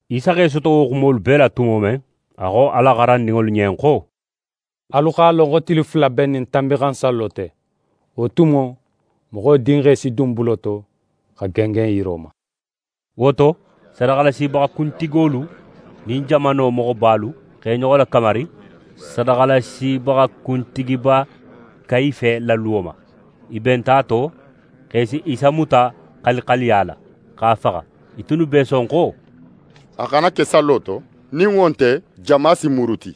Isa x'é soto wo xumolu bee la tumo men, a xo a la xarandinŋolu ɲen xo: «Alu x'a lon xo tili fula be n nin Tanbinxansallo te. Wo tumo, Moxo Dinxe si dun bulo to, xa gengen yiro ma.» Wo to, sadaxalasibaxa kuntigolu nin jamano moxobalu x'e ɲoxo lakamari sadaxalasibaxa kuntigiba Kayife la luwo ma. I benta a to xo i si Isa muta xalixaliya la, x'a faxa. I tunnu b'e son xo: «A xana ke sallo to, nin wo nte, jama si muruti.»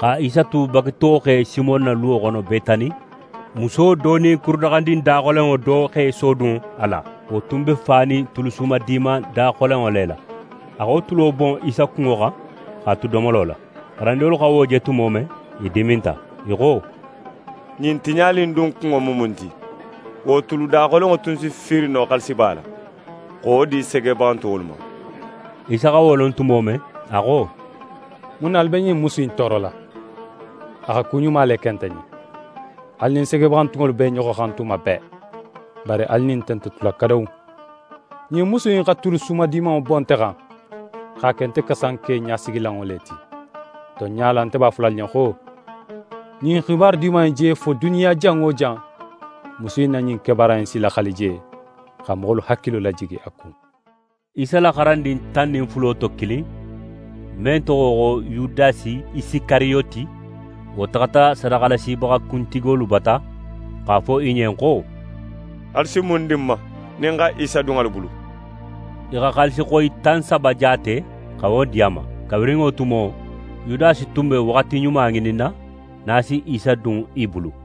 Xa Isa tu bagitoxe Simon na luwo xono Betani, muso do nin kurudaxandin daxolenŋo do x'é sodun a la. Wo tun be fanin tulu sumadiman daxolenŋo le la. A xa wo tulo bon Isa kunŋo xan x'a tu domolo la. xarandinŋolu xa wo je tumo men, i diminta. I xo: «Ɲin tiɲali in dun kunŋo mu mun ti? Wo tulu daxolenŋo tun si fiiri no xaalisiba la xa wo di segebaxantunŋolu ma.» Isa xa wo lon tumo men, a xo: «Mun na alu be ɲin musu in toorola? A xa ku ɲuma le ke nte ɲen. Alu nin segebaxantunŋolu b'e ɲoxo xan tuma bee. Bari alu nin nte nte tula kadawu. Ɲin musu in xa tulu sumadimanŋo bon nte xan, x'a ke nte kasanke ɲasigilanŋo le ti. Tonɲa la, nte b'a fola alu ɲen xo: Ɲin xibaru Diman in je fo duniya jan wo jan, musu in na ɲin kebaara in si laxali je, xa moxolu hakilo lajigi a kun.» Isa la xarandin tan nin fulo to kilin, men toxo xo Yudasi Isikariyoti, wo taxata sadaxalasibaxa kuntigolu bata, x'a fo i ɲen xo: «Alu si mun di ń ma, nin ń xa Isa dun alu bulu?» I xa xaalisixoyi tan saba jaate xa wo di a ma. Kabirin wo tumo, Yudasi tun be waxati ɲuma ŋininna nin a si Isa dun i bulu.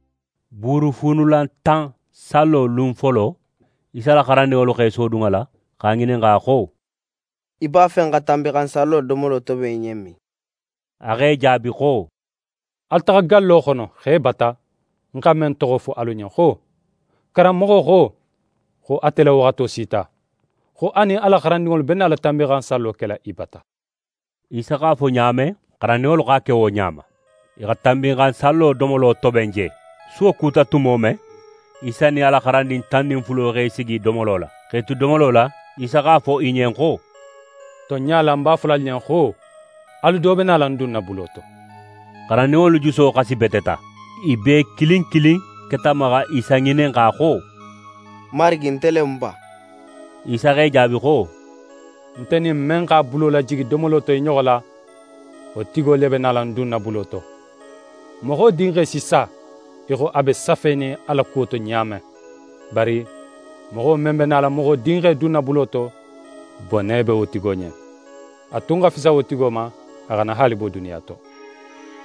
Buurufuunulantan sallo lun folo, Isa la xarandinŋolu x'e sodun a la, x'a ŋininxa xo: «Í b'a fe n xa Tanbinxansallo domolo toben í ɲen min?» A x'e jaabi xo: «Alu taxa gallo xono, xe bata, ń xa men toxo fo alu ɲen xo: “Karanmoxo xo, xo ate la waxato sita, xo a nin a la xarandinŋolu be nala Tanbinxansallo kela í bata.”» Isa x'a fo ɲa men, xarandinŋolu x'a ke wo ɲa ma. I xa Tanbinxansallo domolo toben je. Suwo kuta tumo men, Isa nin a la xarandin tan nin fulo x'e sigi domolo la. X'e tu domolo la, Isa x'a fo i ɲen xo: «Tonɲa la, ń b'a fola alu ɲen xo, alu do be nala ń dunna bulo to.» Xarandinŋolu juso xasibeteta. I bee kilin kilin keta a ma xa Isa ŋininxa xo: «Marigi, nte le mu ba?» Isa x'e jaabi xo: «Nte nin men x'a bulo lajigi domolo to i ɲoxo la, wo tigo le be nala ń dunna bulo to. Moxo Dinxe si sa, í xo a be safenin a la kuwo to ɲa men. Bari moxo men be nala Moxo Dinxe dunna bulo to, bone be wo tigo ɲen. A tun xa fisa wo tigo ma, a xana haali bo duniya to.»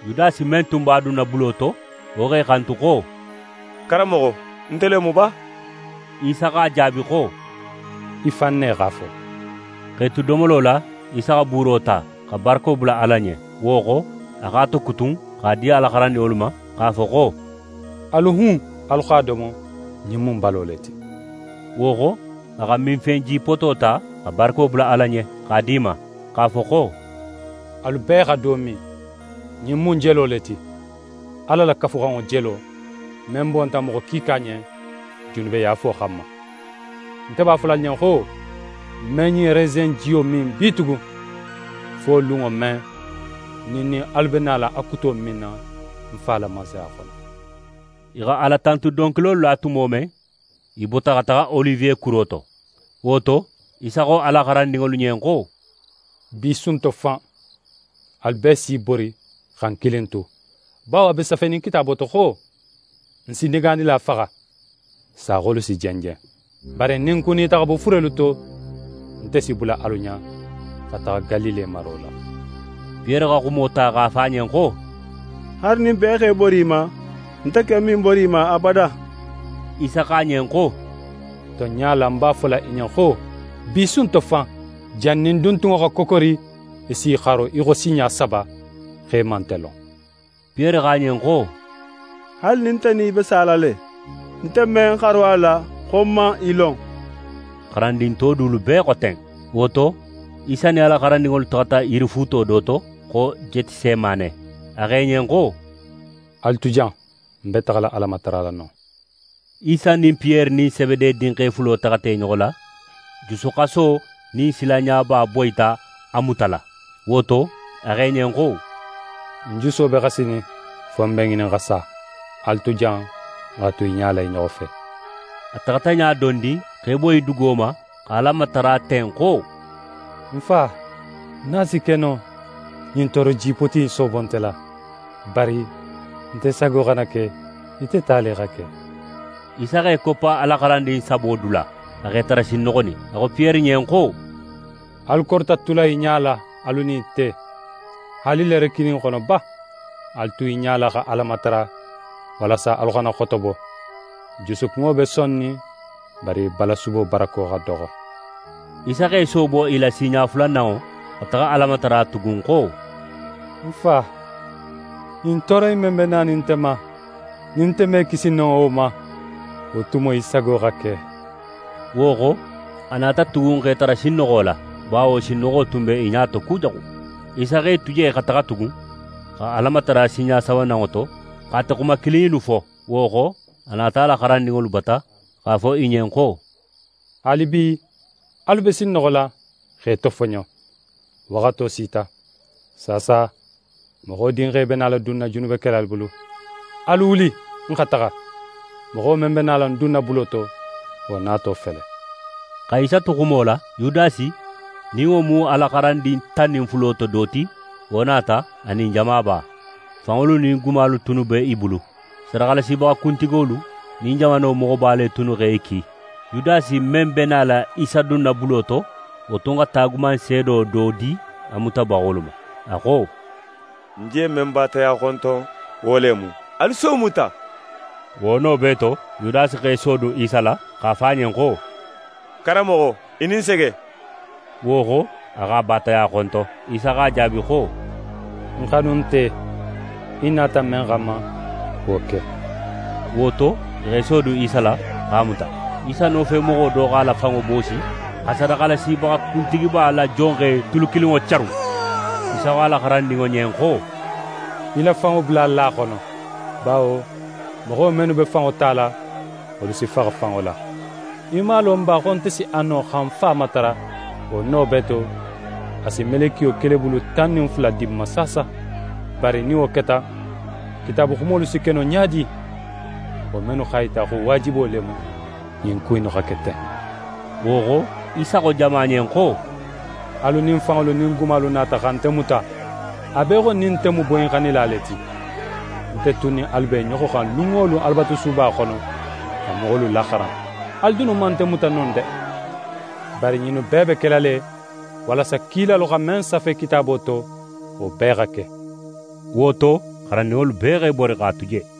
Yudasi men tun b'a dunna bulo to, wo x'e xantu xo: «Karanmoxo, nte le mu ba?» Isa x'a jaabi xo: «Í fan ne x'a fo.» X'e tu domolo la, Isa xa buuro ta, xa barako bula Ala ɲen. Wo xo, a x'a tokutun, x'a di a la xarandinŋolu ma, x'a fo xo: «Alu hun, alu x'a domo. Ɲin mu ń balo le ti.» Wo xo, a xa minfen jipoto ta, xa barako bula Ala ɲen, x'a di i ma, x'a fo xo: «Alu bee xa do min. Ɲin mu ń jelo le ti, Ala la Kafuxanŋo jelo, men bonta moxo kiika ɲen, junubeyaafo xanma. Nte b'a fola alu ɲen xo, ń me ɲin resen in jiyo min bitugun, fo lunŋo men, nin ń nin alu be nala a kuto minna ń Fa la Mansaya xono.» I xa Alatantu donkilolu la tumo men, i bota xa taxa Oliwe kuro to. Wo to, Isa xo a la xarandinŋolu ɲen xo: «Bi su in to fan, alu bee si i bori xa ń kilin tu, bawo a be safenin Kitaabo to xo: “Ń si negaanila faxa, saaxolu si jenjen.” Bari nin ń kunita xa bo furelu to, nte si bula alu ɲa xa taxa Galile maro la.» Piyere xa xumo ta x'a fo a ɲen xo: «Haali nin bee x'e bori í ma, nte ken me ń bori í ma abada!» Isa xo a ɲen xo: «Tonɲa la, ń b'a fola í ɲen xo, bi su in to fan, jannin duntunŋo xa kokori, í si í xaro í xo sinɲa saba, xo í man nte lon.» Piyere xo a ɲen xo: «Haali nin nte nin í be sala le, nte me ń xaro a la, xo ń man í lon.» Xarandin to dulu bee xo ten. Wo to, Isa nin a la xarandinŋolu taxata yirifuuto do to, xo Jetisemane. A xo i ɲen xo: «Alu tu jan, ń be taxala Ala matarala non.» Isa nin Piyere nin Sebede dinxe fulo taxata i ɲoxo la. Jusuxaso nin silanɲaba boyita a mutala. Wo to, a xo i ɲen xo: «Ń juso be xasinin, fo ń be ŋinin xa sa. Alu tu jan, n xa tu i ɲala i ɲoxo fe.» A taxata ɲa dondin x'é boyi dugo ma, xa Ala matara ten xo: «Ń Fa, nin a si ke no, ɲin tooro jipoti in soobo nte la. Bari, nte sago xana ke, ite ta le xa ke!» Isa x'é koppa a la xarandin sabo dula, a x'e tara sinnoxonin. A xo Piyere ɲen xo: «Alu korita tula i ɲala, alu nin nte, haali leere kilin xono ba? Alu tu i ɲala xa Ala matara, walasa alu xana xotobo. Jusukunŋo be sonnin, bari balasubo barako xa doxo.» Isa x'é soobo i la sinɲa fulananŋo xa taxa Ala matara tugun xo: «Ń Fa, ɲin tooro in men be nanin nte ma, nin nte me kisi no wo ma, wo tumo í sago xa ke.» Wo xo, a nata tugun x'e tara sinnoxola, bawo sinnoxo tun be i ɲa to kujaxu. Isa x'e tu je xa taxa tugun, xa Ala matara sinɲa sabananŋo to, xa ate xuma kilin innu fo. Wo xo, a nata a la xarandinŋolu bata, x'a fo i ɲen xo: «Haalibi, alu be sinnoxola, x'e tofoɲo! Waxato sita. Saasa, Moxo Dinxe be nala dunna junubekelalu bulu. Alu wuli, n xa taxa! Moxo men be ń dunna bulo to, wo nato fele.» Xa Isa tu xumo la, Yudasi, nin wo mu a la xarandin tan nin fulo to do ti, wo nata, a nin jamaba. Fanŋolu nin gumalu tunnu be i bulu. Sadaxalasibaxa kuntigolu nin jamano moxoba le tunnu x'e ki. Yudasi men be nala Isa dunna bulo to, wo tun xa taagumanseedo do di a mutabaxolu ma. A xo: «Ń je men baataya xonton, wo le mu. Alu si wo muta!» Wo no bee to, Yudasi x'é sodun Isa la, x'a fo a ɲen xo: «Karanmoxo, í nin sege!» Wo xo, a x'a baataya xonton. Isa x'a jaabi xo: «Ń xanunte, í nata men xanma, wo ke.» Wo to, i x'e sodun Isa la, x'a muta. Isa nofemoxo do x'a la fanŋo boosi, xa sadaxalasibaxa kuntigiba la jonxe tulu kilinŋo carun. Isa xo a la xarandinŋo ɲen xo: «Í la fanŋo bula a la xono; bawo moxo mennu be fanŋo tala, wolu si faxa fanŋo la. Í man a lon ba xo nte si a no xa ń Fa matara, wo no bee to, a si melekiyo kelebulu tan nin fula di ń ma saasa? Bari nin wo keta, Kitaabu xumolu si ke no ɲa di? Wo mennu x'a yita xo waajibo le mu ɲin ku innu xa ke ten.» Wo xo, Isa xo jama ɲen xo: «Alu nin fanŋolu nin gumalu nata xa nte muta, a be í xo nin nte mu boyinxannila le ti. Nte tun nin alu be i ɲoxo xan lun wo lun Alabatusuba xono, xa moxolu laxaran. Alu dunnu man nte muta non de. Bari ɲinnu bee be kela le, walasa kilalu xa men safe Kitaabo to, wo bee xa ke.» Wo to, xarandinŋolu bee x'e bori, x'a tu je.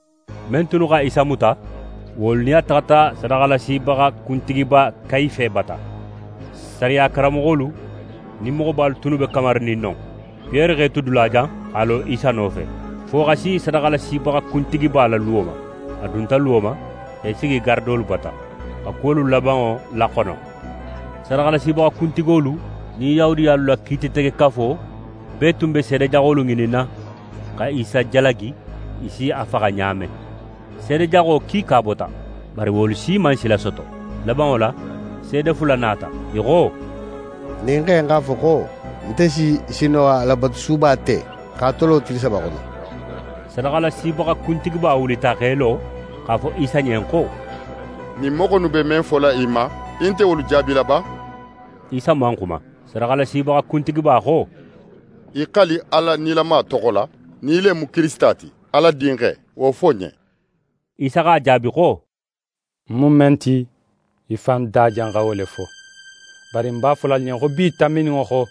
Men tunnu xa Isa muta, wolu nin a taxata sadaxalasibaxa kuntigiba Kayife bata. Sariya karanmoxolu nin moxobalu tunnu be kamarinin non. Piyere x'é tu dulajan, x'a lo Isa nofe, fo xa si sadaxalasibaxa kuntigiba la luwo ma. A dunta luwo ma, x'é sigi garadolu bata, xa kuwolu labanŋo laxono. Sadaxalasibaxa kuntigolu nin Yahudiyalu la Kiititegekafo bee tun be seede jaxolu ŋininna, xa Isa jalagi i si a faxa ɲa men. Seede jaxo kiika bota, bari wolu si man sila soto. Labanŋo la, seede fula nata. I xo: «Ɲin xe in x'a fo xo: “Nte si sin no xa Alabatusuba te, x'a tolo tili saba xono”.» Sadaxalasibaxa kuntigiba wulita x'é lo, x'a fo Isa ɲen xo: «Ɲin moxo innu be men fola í ma, í nte wolu jaabila ba?» Isa man xuma. Sadaxalasibaxa kuntigiba xo: «Í xali Ala nilama toxo la, nin í le mu Kirisita ti, Ala Dinxe, wo fo n ɲen.» Isa x'a jaabi xo: «Ń mu men ti, í fan da janxa wo le fo. Bari ń b'a fola alu ɲen xo bi tanbininŋo xo,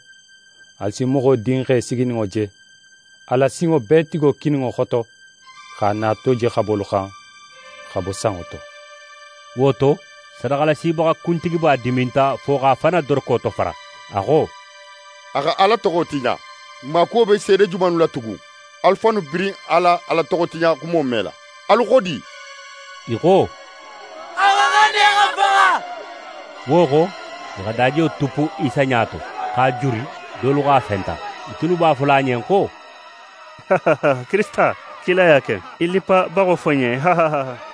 alu si Moxo Dinxe sigininŋo je, Ala, Sinŋobeetigo kininŋo xoto, x'a nato je xabolu xan, xa bo sanŋo to.» Wo to, sadaxalasibaxa kuntigiba diminta fo x'a fan na doroko tofara. A xo: «A xa Ala toxo tiɲa! N maakuwo be seede jomannu la tugun? Alu fannu birin a la Ala toxotiɲaxumo mela. Alu xo di?» I xo: «A xa xan ne xa faxa.» Wo xo, i xa dajiyo tuppu Isa ɲa to, x'a juri, dolu x'a fenta. I tunnu b'a fola a ɲen xo: «Kirisita, kilaya ke. Í lippabaxo fo n ɲen!»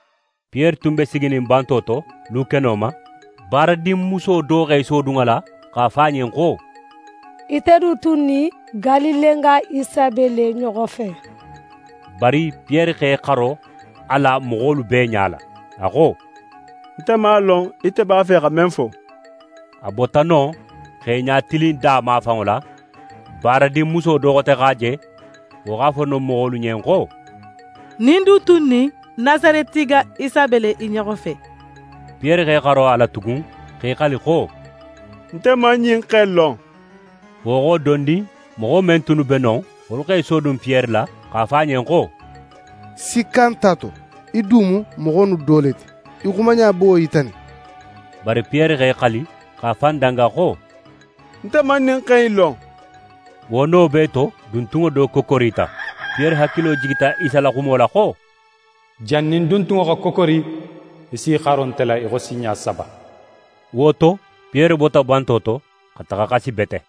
Piyere tun be siginin banto to, lukeno ma. Baaradinmuso do x'é sodun a la, x'a fo a ɲen xo: «Ite du tun nin Galilenga Isa be le i ɲoxo fe!» Bari Piyere x'é xaro a la moxolu bee ɲala, a xo: «Nte man a lon, ite b'a fe xa men fo.» A bota non x'é ɲatilin da mafanŋo la, baaradinmuso do xote x'a je. Wo x'a fo non moxolu ɲen xo: «Ɲin du tun nin Nasaretinga Isa be le i ɲoxo fe.» Piyere x'é xaro a la tugun, x'é xali xo: «Nte man ɲin xe in lon.» Wo xo dondin, moxo men tunnu be non, wolu x'e sodun Piyere la, x'a fo a ɲen xo: «Sikka nt'a to, í du mu moxo innu do le ti! Í xumaɲa be wo yitanin.» Bari Piyere x'é xali, x'a fan danga xo: «Nte man ɲin xe in lon.» Wo no bee to, duntunŋo do kokorita. Piyere hakilo jigita Isa la xumo la xo: «Jannin duntunŋo xa kokori, í s'í xaro nte la í xo sinɲa saba.» Wo to, Piyere bota banto to, xa taxa xasi bete.